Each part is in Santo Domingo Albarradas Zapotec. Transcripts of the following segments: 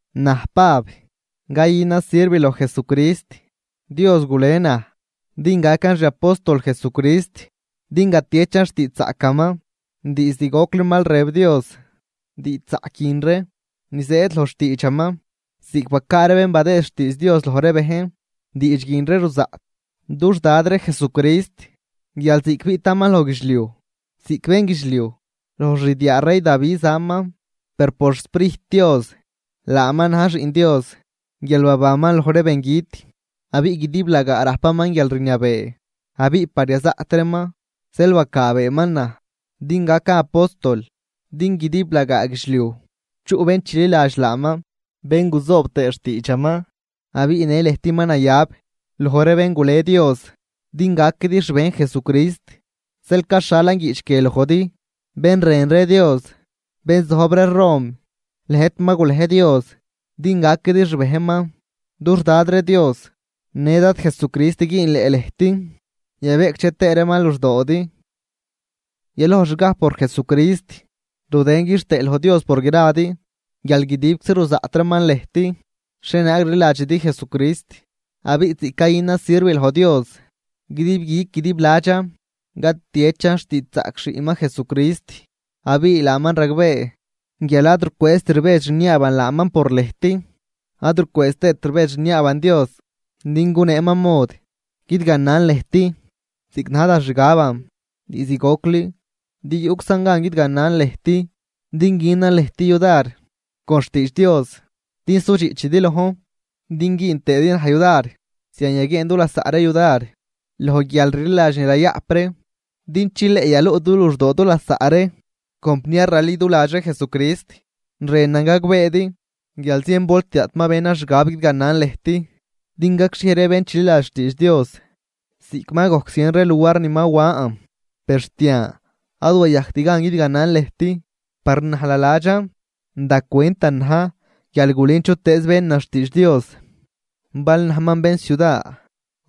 Naj Pab, cayünan sirv loj Jesucrist, Dios gule naj din gacan xi apóstol Jesucrist, din gatiechan xtiidxzaꞌcaman. Diizd gocli mal rëb Dios diidxzaꞌc guin ree, ni zëëd loj xtiidxaman ziꞌc bacaa ree bén badëë xtiidx Dios loj ree bejn, diidx guin ree ruzaꞌt, dux Dad ree Jesucrist guial ziꞌc biꞌtaman loj guidxliuj ziꞌc bénguidxliuj, loj xdiaa rey Davi zaman. Per por xSprijt Dios laaman na̱j Xiꞌn Dios guial babanman loj ree bengüt, abiꞌ guidiblagaa rajpaman guialrniabee. Abiꞌ par yazaꞌt reeman, zeel bacaabeeman naj din gacan apóstol din guidiblagaa guidxliuj chuꞌ bén chililadx laaman, bén guzoob tëë xtiidxaman. Abiꞌ në lëjt ma nayab loj ree bén gule Dios din gaquidi xbejn Jesucrist. Zeel caxhalan guiꞌch guie lojdi bén rën ree Dios, bén zojb ree Rom, lëjt ma gulej Dios din gaquidi xbejnman. Dux Dad ree Dios në Dad Jesucrist güünleꞌ lëjt yabeꞌcdxe tëë reeman luxdoodi. Yalojxgaj por Jesucrist rudën quixtëë loj Dios por gradi, guial guidibczi ruzaꞌt reeman lëjt xhienaag rliladxidi Jesucrist. Abiꞌ ziꞌc cayünan sirv loj Dios, guidib guic guidib ladxan catiechan xtiidxzaꞌc Xiꞌnman Jesucrist, abiꞌ laaman ragbee guial ad rucwëëzt rbedx rniaaban laaman por lëjt. Ad rucwëëz tëët rbedx rniaaban Dios din guneeman mod guidganan lëjt, ziꞌc na̱j da xgaban diizd gocli. Din yuꞌczan gan guidganan lëjt din günan lëjt yudar con xtiidx Dios din sudxiꞌchidi lojn. Din güün tëëdi naj yudar zian yaguieen du lasaꞌ ree yudar loj guialrliladx ni rayaꞌp ree, din chileꞌ yaluꞌ du luxdoo du lasaꞌ ree. Compniar raliduladx ree Jesucrist, rënan gagbeedi guial zien volti daꞌt ma benan xgab guidganan lëjt, din gacxhiej ree bén chililadx xtiidx Dios, ziꞌc ma gojc zien ree luar ni ma wan, per xt yan ad wayajct gan guidganan lëjt. Par naj naladxan da cwentan na̱j guial gulün chutëëz benan xtiidx Dios, bal najman bén ciuda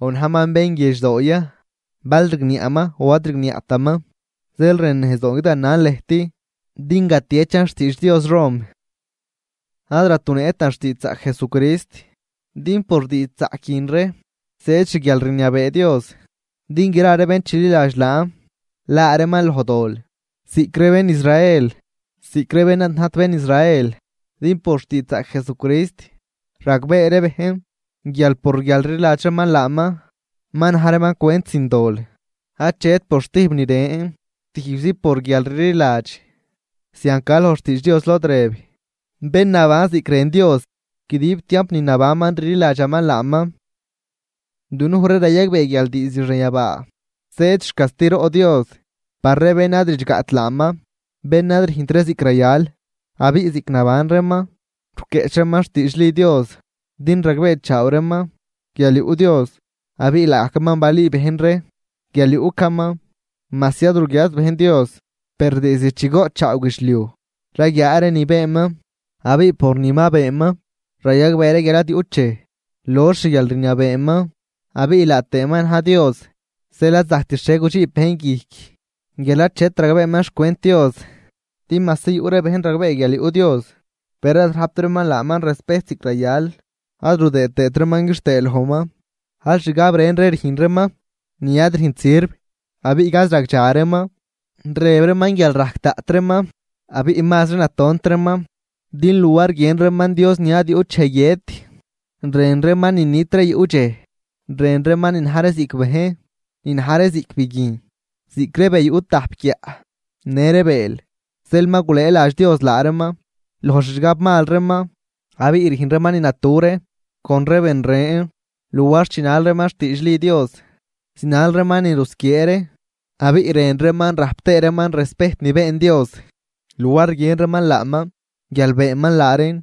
o najman bén guiedxdoo ya, bal rigniaꞌman o ad rigniaꞌtaman. Zeel rënnejzdoon guidganan lëjt din gatiechan xtiidx Dios Rom. Ad ratunëꞌtan xtiidxzaꞌc Jesucrist. Din por diidxzaꞌc guin ree zëëd xguialrniabee Dios, din gra ree bén chililadx laan laa reeman loj dol, ziꞌc ree bén Israel ziꞌc ree bén ad najt bén Israel. Din por xtiidxzaꞌc Jesucrist ragbee ree bejn guial por guialrliladx reeman laaman ma na̱j reeman cwent sin dol: achet por stijb ni ren tijbzi por guialrliladx. Zian ca loj xtiidx Dios lod rëb: “Bén naban ziꞌc rën Dios, guidib tiamp ni nabanman rliladxaman laaman.” Dunuj ree rayagbee guial diizd xanyabaa zëëd xcastiroꞌ Dios par ree bén ad ridxgaꞌt laaman, bén ad rüjnt ree ziꞌc rayal, abiꞌ ziꞌc naban reeman ruquieꞌch reeman xtiidxli Dios. Din ragbeechaaw reeman guial yuꞌ Dios, abiꞌ laagajcaman balüü bejn ree guial yuꞌcaman. Majsi ad ruguiaat bejn Dios, per diizd chi goꞌtchaaw guidxliuj raguiaa ree ni beenman, abiꞌ por ni ma beenman rayagbee ree guial ad yuꞌt dxej lox xguialrniabeeman abiꞌ laa tëëman na̱j Dios. Zeel ad zajct xhie gudxiib bejn guijc guial achet ragbeeman xcwent Dios. Din majsi yuꞌ ree bejn ragbee guial yuꞌ Dios, per ad rajpt reeman laaman respejt ziꞌc rayal, ad rudëë tëët reeman quixtëë lojman, aal xgab ren ree rüjn reeman ni ad rüjnt sirv abiꞌ gaz ragdxa reeman. Rëb reeman guial rajc daꞌt reeman abiꞌ mazri na tont reeman. Din luar guiën reeman Dios ni ad yuꞌt dxej guiët, rën reeman ni nit ree yuꞌ dxej, rën reeman ni na̱j ree ziꞌc bejn, ni na̱j ree ziꞌc biguijn, ziꞌc ree be yuꞌ tajp guiaꞌ në ree bëël. Zeel ma gulëëladx Dios laa reeman loj xixgab mal reeman, abiꞌ rüjn reeman ni natu ree con ree ben ren. Luar chinal reeman xdiidxli Dios, zinal reeman ni rusquiee ree. Abiꞌ rën reeman rajp tëë reeman respejt ni been Dios, luar guiën reeman laaman guial beenman laa reen,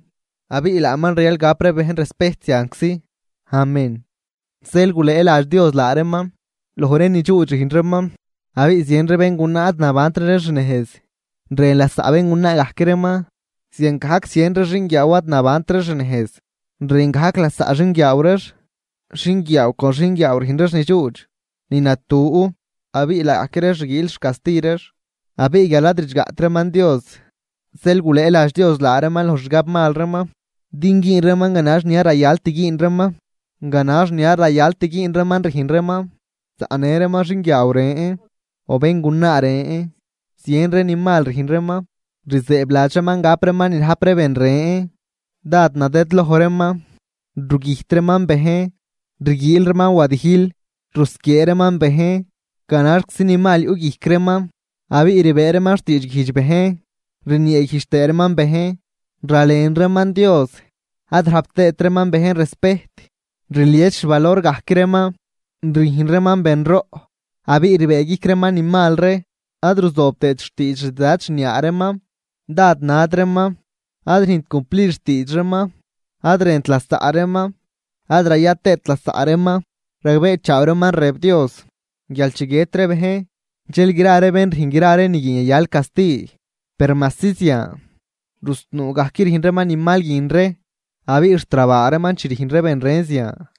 abiꞌ laaman rayal gap ree bejn respejt zianczi. Amén. Zeel gulëëladx Dios laa reeman loj ree ni dxuudx rüjn reeman. Abiꞌ zien ree béngunaa ad nabantri ree xnejz, rën lasaꞌ béngunaa gajc reeman. Ziangajc zien ree xinguiaaw ad nabantri xnejz, rën gajc lasaꞌ xinguiaaw reex, xinguiaaw con xinguiaaw rüjn reex ni dxuudx, ni natu. Abiꞌ laagajc reex rguiil xcasti reex. Abiꞌ guial ad ridxgaꞌt reeman Dios, zeel gulëëladx Dios laa reeman loj xixgab mal reeman, din güün reeman ganax ni ad rayalt güün reeman. Ganax ni ad rayalt güün reeman rüjn reeman, zaꞌnë reeman xinguiaaw ren o béngunaa ren, zien ree ni mal rüjn reeman, rzëëbladx reeman gap reeman ni rajp ree ben ren. Dád nadëdloj reeman, rugüjt reeman bejn, rguiil reeman wadijl, rusquiee reeman bejn, ganaxczi ni mal yuꞌguijc reeman abiꞌ rbëë reeman xtiidxguijdx bejn. Rnieeguijdx tëë reeman bejn, ralen reeman Dios, ad rajpt reeman bejn respejt, rlies xvalor gajc reeman, rüjn reeman benroꞌ. Abiꞌ rbëëguijc reeman ni mal ree, ad ruzoob tëët xtiidx xdad xniaa reeman. Dád nad reeman, ad rüjnt cumplid xtiidx reeman, ad rënt lasaꞌ reeman, ad raya tëët lasaꞌ reeman. Ragbeechaaw reeman rëb Dios guial chi guiët ree bejn, dxel gra ree bén rüjn gra ree ni guin yayal casti. Per majsi zian, rusnuu gajc rüjn reeman ni mal guin ree abiꞌ xt rabaa reeman chi rüjn ree ben ren zian.